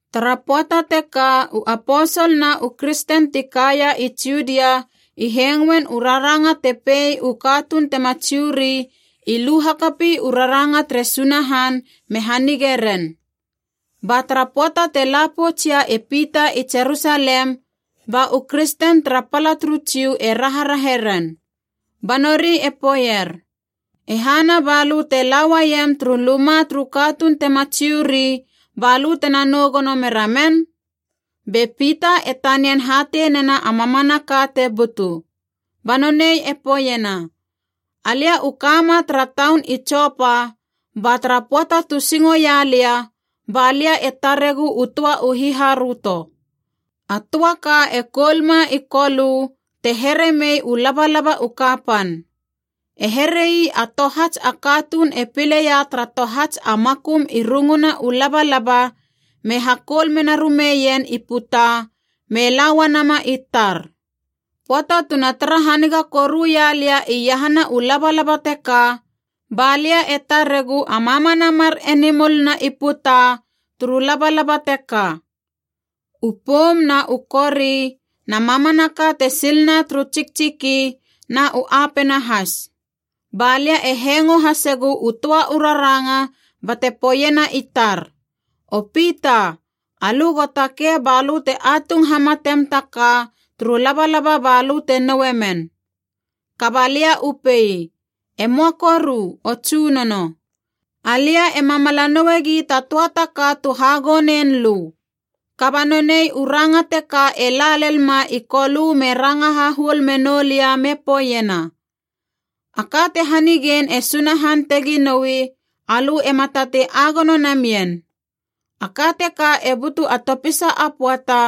Tara pöata teka u aposol na u kristen ti kaia i Judia i hengoen u raranga te pei u katuun tema Jiu ri i lu hakapi u raranga tere Sunahan me hanige ren. Ba tara pöata te la poutsia e Pita i Jerusalem, ba u kristen tara pala turu Jiu e raharahe ren. Ba nori e poeier, “E hana balö e lauaiem turu luma turu katuun tema Jiu ri, balö tena nou gono mera men?” Be Pita e tanian hatei nena a mamanaka te butu. Ba nonei e poeiena, “Alia u kama tara taun i Jopa ba tara pöata tu singo ia lia ba lia e taregu u töa u hiharöto. A töa ka e koulma i Kolö te here mei u labalaba u kapan. E here ii a tohats a katuun e pileia tara tohats a makum i runguna u labalaba me hakoul menarumeien i puta me la uanama i tar. Pöata tuna tara haniga koru ia lia iahana u labalaba teka ba lia e taregu a mamana mar enimol na i puta turu labalaba teka, u poum na u kori na mamanaka te silna turu tsiktsiki, na u apena has. Ba lia e hengo hasegu u töa u raranga bate poeiena i tar, ‘O Pita, alö go takei ba lö te atung hamatem ta ka turu labalaba balö te noue men.’ “Kaba lia u pei, ‘E möa koru, o Tsunono. Alia ema mala nouegi ta töa ta ka tu hagonein lö.’ Kaba nonei u ranga teka e la lelma i Kolö me ranga hahuol menou lia me poeiena, ‘A ka te hanigein e Sunahan tegi noui, alö ema tatei agono namien.’ A ka teka e butu a topisa a pöata,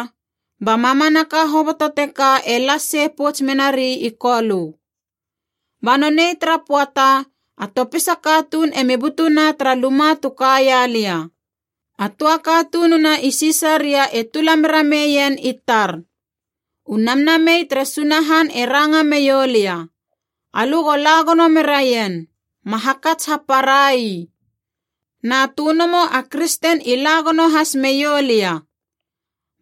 ba mamanaka hoboto teka e las sei pouts menari i Kolö. “Ba nonei tara pöata, a topisa katuun emi butuna tara luma tu kaia lia. A töa katununa i Sisaria e tula mera meien i tar. U Namnamei tere Sunahan e ranga meioulia, ‘Alö go la gono meraien, ma hakats hapara ii.’ Na tönomo a kristen i la gono has meiou lia.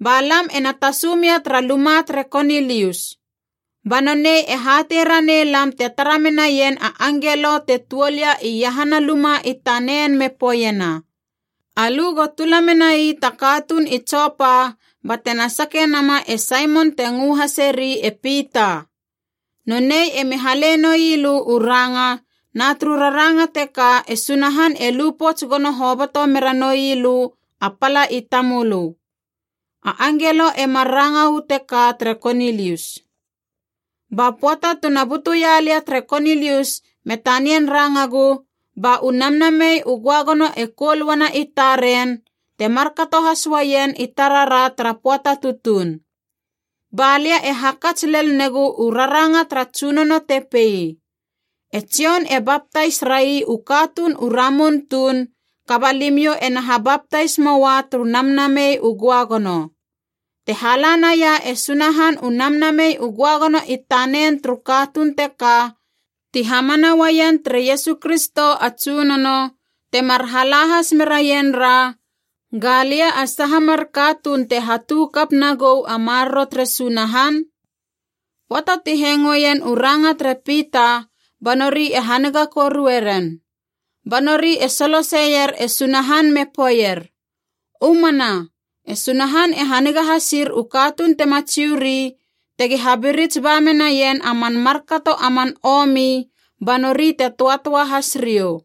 Ba lam ena tasu mia tara luma tere Konilius. Ba nonei e hatei ranei lam te tara menaien a angelo te tuol ia iahana luma i tanen me poeiena, ‘Alö go tula menai ta katuun i Jopa, batena sake nama e Saimon te ngö haseri e Pita. Nonei emi hale noi lö u ranga, na turu raranga teka e Sunahan e lu pouts gono hoboto mera noi lö a pala i tamölö.’ A angelo e mar ranga uu teka tere Konilius. “Ba pöata tu na butuia lia tere Konilius me tanian rangagu, ba u Namnamei u Göagono e koul uana i taren, te markato has uaien i tarara tara pöata tutuun. Ba lia e hakats lel negu u raranga tara Tsunono te pei, ‘E Jon e baptais ra ii u katuun u ramun tuun, kaba limiou ena habaptais moua turu Namnamei u Göagono.’ Te hala naia e Sunahan u Namnamei u Göagono i tanen turu katuun teka ti hamana uaien tere Iesu Kristo a Tsunono, temar hala has meraien ra, galia a saha mar katuun te hatu kap nagou a maroro tere Sunahan?” Pöata ti hengoien u ranga tere Pita, ba nori e haniga korue ren. Ba nori e soloseier e Sunahan me poeier, “U mana, e Sunahan e haniga hasir u katuun tema Jiu ri tegi habirits ba menaien a man markato a man omi ba nori te töatöa has riou!”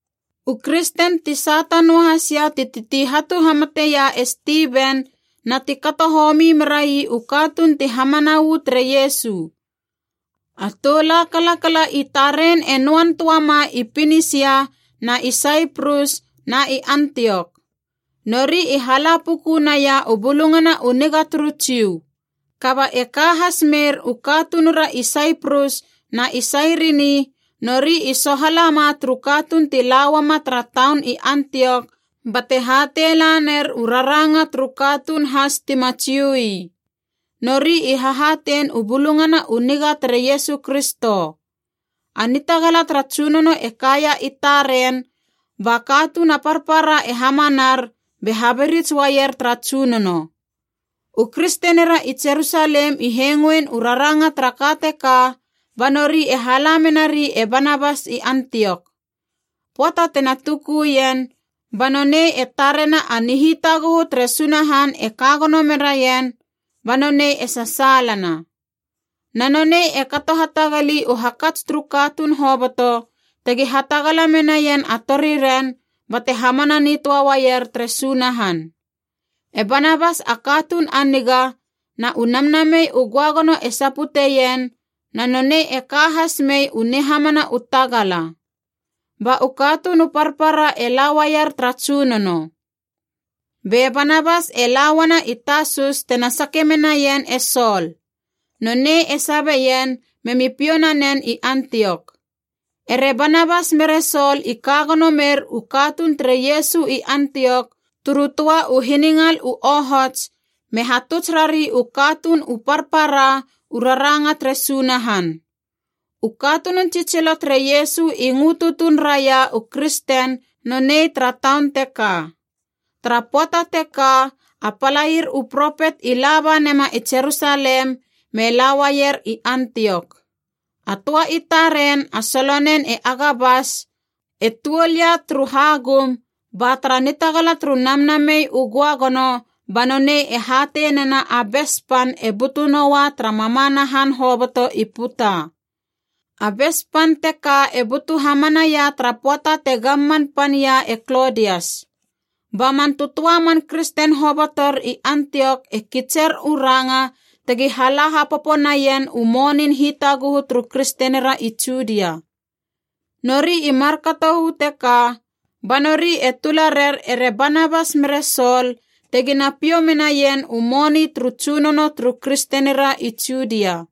U kristen ti sata noahasia ti titi hatu hamateia e Stiven na ti kato homi merai u katuun ti hamana uu tere Iesu. A tou la kalakala i taren e noan töa ma i Pinisia na i Saiprus na i Antiok. Nori i hala puku naia u Bulungana u Niga turu Jiu. Kaba e ka has meir u katunura i Saiprus na i Sairini, nori i sohala ma turu katuun ti lauama tara taun i Antiok bate hatei laner u raranga turu katuun has tima Jiu ii. Nori i hahatein u Bulungana u Niga tere Iesu Kristo. A nitagala tara Tsunono e kaia i taren, ba katuun a parpara e hamanar be habirits uaier tara Tsunono. U kristenira i Jerusalem i hengoin u raranga tara ka teka, ba nori e hala menari e Banabas i Antiok. Pöata tena tukuien, ba nonei e tarena a nihitaguhu tere Sunahan e ka gono meraien, ba nonei e sasaalana. Na nonei e kato hatagali u hakats turu katuun hoboto tegi hatagala menaien a toriren bate hamana nitöa uaier tere Sunahan. E Banabas a katuun a niga, na u Namnamei u Göagono e saputeien, na nonei e ka has mei u nihamana u tagala. Ba u katuun u parpara e la uaier tara Tsunono. Be Banabas e la uana i Tasus tena sake menaien e Sol. Nonei e sabeien memi piou nanen i Antiok. Ere Banabas mere Sol i ka gono mer u katuun tere Iesu i Antiok turu töa u hiningal u ohots, me hatuts rari u katuun u parpara, u raranga tere Sunahan. U katunun tsitsilo tere Iesu i ngö tutuun raia u kristen nonei tara taun teka. Tara pöata teka, a palair u propet i laba nema i Jerusalem, me la uaier i Antiok. A töa i taren, a solonen e Agabas, e tuol ia turu hagum, ba tara nitagala turu Namnamei u Göagono ba nonei e hatei nena a bes pan e butu noa tara mamana han hoboto i puta. A bes pan teka e butu hamanaia tara pöata te gamman pan ia e Klodias. Ba man tötöa man kristen hobotor i Antiok e kitser u ranga tegi hala hapopo naien u monin hitaguhu turu kristenira i Judia. Nori i markato uu teka, ba nori e tula rer ere Banabas mere Sol tegina piou menaien u moni turu tsunono turu kristenira i Judia.